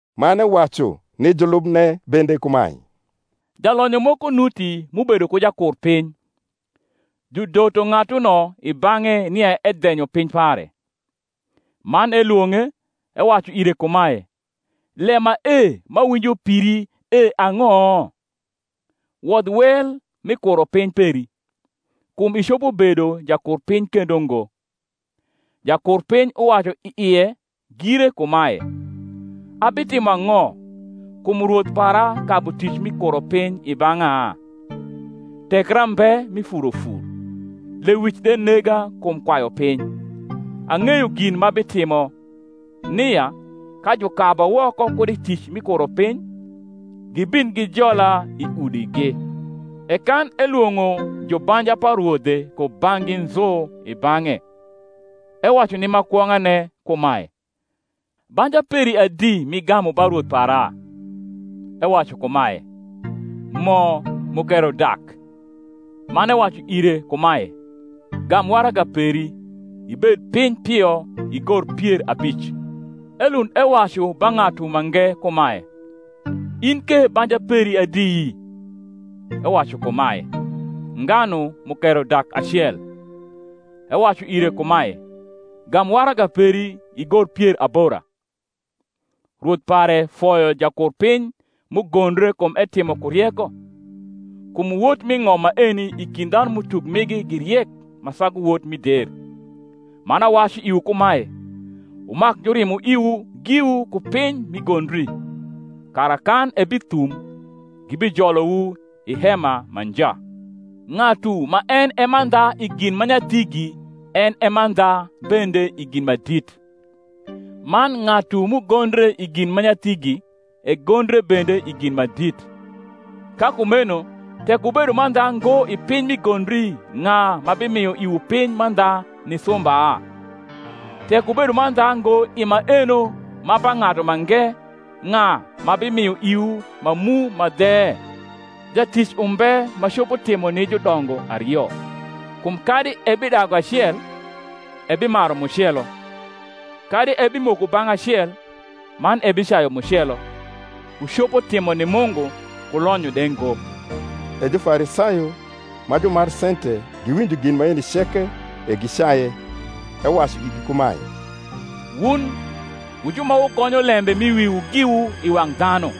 Man ewacu ni julubne bende kumae, Jalonyo moko nuti m’ubedo ku jakurpiny; judoto ng’atuno i bang’e nia edhenyo piny pare. Man elwong’e, ewacu ire kumae, Lem mae m’awinjo piri e ang’o? wodh wel mi kuropiny peri; kum icopo bedo jakurpiny kendo ngo. Jakurpiny uwacu i ie gire kumae, Abitimo ang’o, kum rwoth para kabu tic mi kuropiny i bang’a? Tekra mbe mi furofur; lewic de nega kum kwayu piny. Ang’eyo gin m’abitimo, nia, ka jukaba woko kud i tic mi kuropiny, gibin gijola i udigi. E kan elwong’o jubanja pa rwodhe kubang’gi nzu i bang’e, ewacu ni ma kwong’ane kumae, Banja peri adi m’igamu ba rwoth para? Ewacu kumae, Mo mukero dak. Man ewacu ire kumae, Gam waraga peri, ibed piny pio igor pier abic. Elund ewacu ba ng’atu mange kumae, Tn ke banja peri adi? Ewacu kumae, Nganu mukero dak acel. Ewacu ire kumae, Gam waraga peri, igor pier abora. Rwoth pare foyo jakurpiny m’ugondre kum etimo ku rieko: kum wot mi ng’om maeni i kind dhanum’utuk migi gi riek ma sagu wot mi der. Man awacu iwu kumae, Wumak jurimo iwu giwu ku piny mi gondri; kara, kan ebithum, gibijolowu i hema ma nja. Ng’atu ma en e mandha i gin ma nyathigi en e mandha bende i gin ma dit: man ng’atu m’ugondre i gin ma nyathigi egondre bende i gin ma dit. Ka kumeno tek wubedo mandha ngo i piny mi gondri ng’a ma bimio iwu piny mandha ni sumba? Tek wubedo mandha ngo i maeno ma pa ng’atu mange, ng’a ma bimio iwu ma mu ma dhe? Jatic umbe ma copo timo ni judongo ario: kum kadi ebidagu acel, ebimaru mucelo; kadi ebimoko bang’ acel, man ebicayu mucelo. Wucopo timo ni Mungu ku lonyo de ngo. E Jufarisayo, ma jumar sente, giwinjo gin maeni ceke; e gicaye. Ewacu igi kumae, Wun wu ju ma wugonyo lembe m’i wiwu giwu i wang’ dhanu;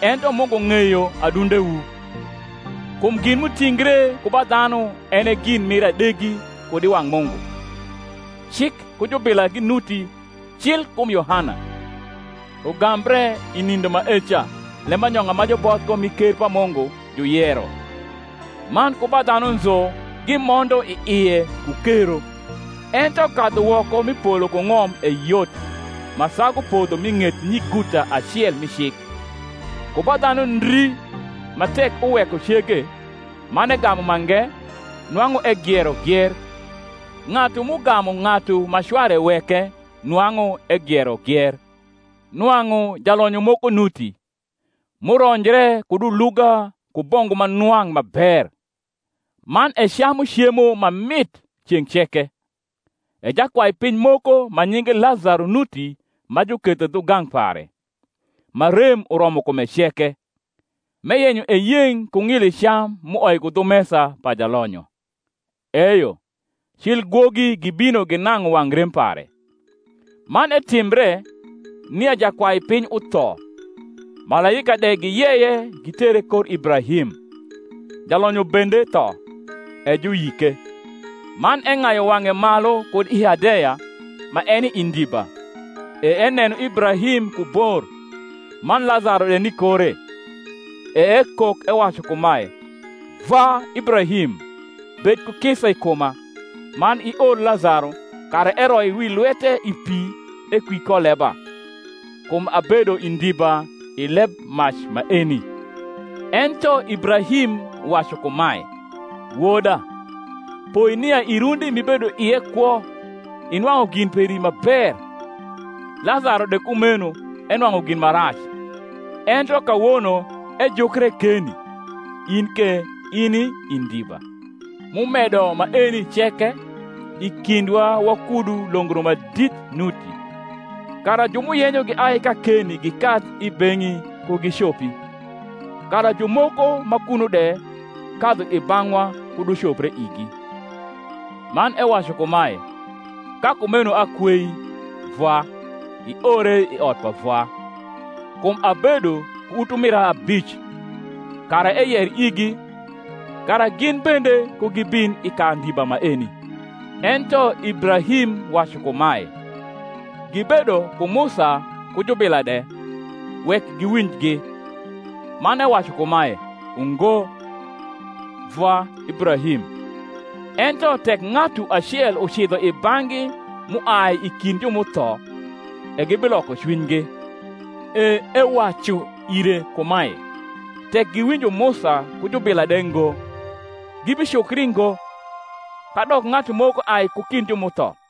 ento Mungu ng’eyo adundewu: kum gin m’utingre ku ba dhanu en e gin mir adegi kud i wang’ Mungu. Cik ku jubila ginuti cil kum Yohana: ugambre i nindo maeca lembanyong’a ma juboth ko mi ker pa Mungu juyero, man ku ba dhanu nzu gimondo i ie ku kero. Ento kadhu woko mi polo ku ng’om e yot, ma sagu podho mi ng’et nyiguta acel mi cik. Ku ba dhanu ndri ma tek uweko cege, man egamu mange, nwang’u egiero gier: ng’atu m’ugamu ng’atu ma cware weke nwang’u egiero gier. Nwang’u jalonyo moko nuti, m’uronjre kud uluga ku bongu ma nwang’ ma ber, man ecamu cemo ma mit ceng’ ceke: e jakwaipiny moko ma nyinge Lazaro nuti ma juketho dhugang’ pare, ma rem uromo kume ceke, m’eyenyo eyeng’ ku ng’ili cam m’uoi ku dhu mesa pa jalonyo; eyo, cil gwogi gibino ginang’u wang’ rem pare. Man etimbre, nia jakwaipiny utho, malaika de giyeye gitere kor Ibrahim: jalonyo bende tho, e juyike. Man eng’ayu wang’e malu kud i Hadeya, ma eni i ndiba, e eneno Ibrahim ku bor, man Lazaro de ni kore. E ekok ewacu kumae, Vwa Ibrahim, bed ku kisa i kuma, man ior Lazaro, kara eroi wi lwete i pi, ekwi ko leba; kum abedo i ndiba i lebmac maeni. Ento Ibrahim wacu kumae, Woda, poi nia i rundi m’ibedo ie kwo inwang’u gin peri ma ber, Lazaro de kumeno enwang’u gin ma rac: ento kawono ejukre keni, in ke ini i ndiba. M’umedo maeni ceke, i kindwa wakudu longro ma dit nuti, kara ju m’uyenyo giai kakeni gikadh i beng’i ku gicopi, kara jumoko ma kuno de kadhu i bang’wa kud ucopre igi. Man ewacu kumae, Ka kumeno akweii, vwa, iore i ot pa vwa; kum abedo ku utumira abic; kara eyer igi, kara gin bende ku gibin i ka ndiba maeni. Ento Ibrahim wacu kumae, Gibedo ku Musa ku jubila de, wek giwinjgi. Man ewacu kumae, Ungo, vwa Ibrahim: ento tek ng’atu acel ucidho i bang’gi m’uai i kind ju m’utho, e gibiloko cwinygi. E ewacu ire kumae, Tek giwinjo Musa ku jubila de ngo, gibicukri ngo, kadok ng’atu moko ai ku kind ju m’utho.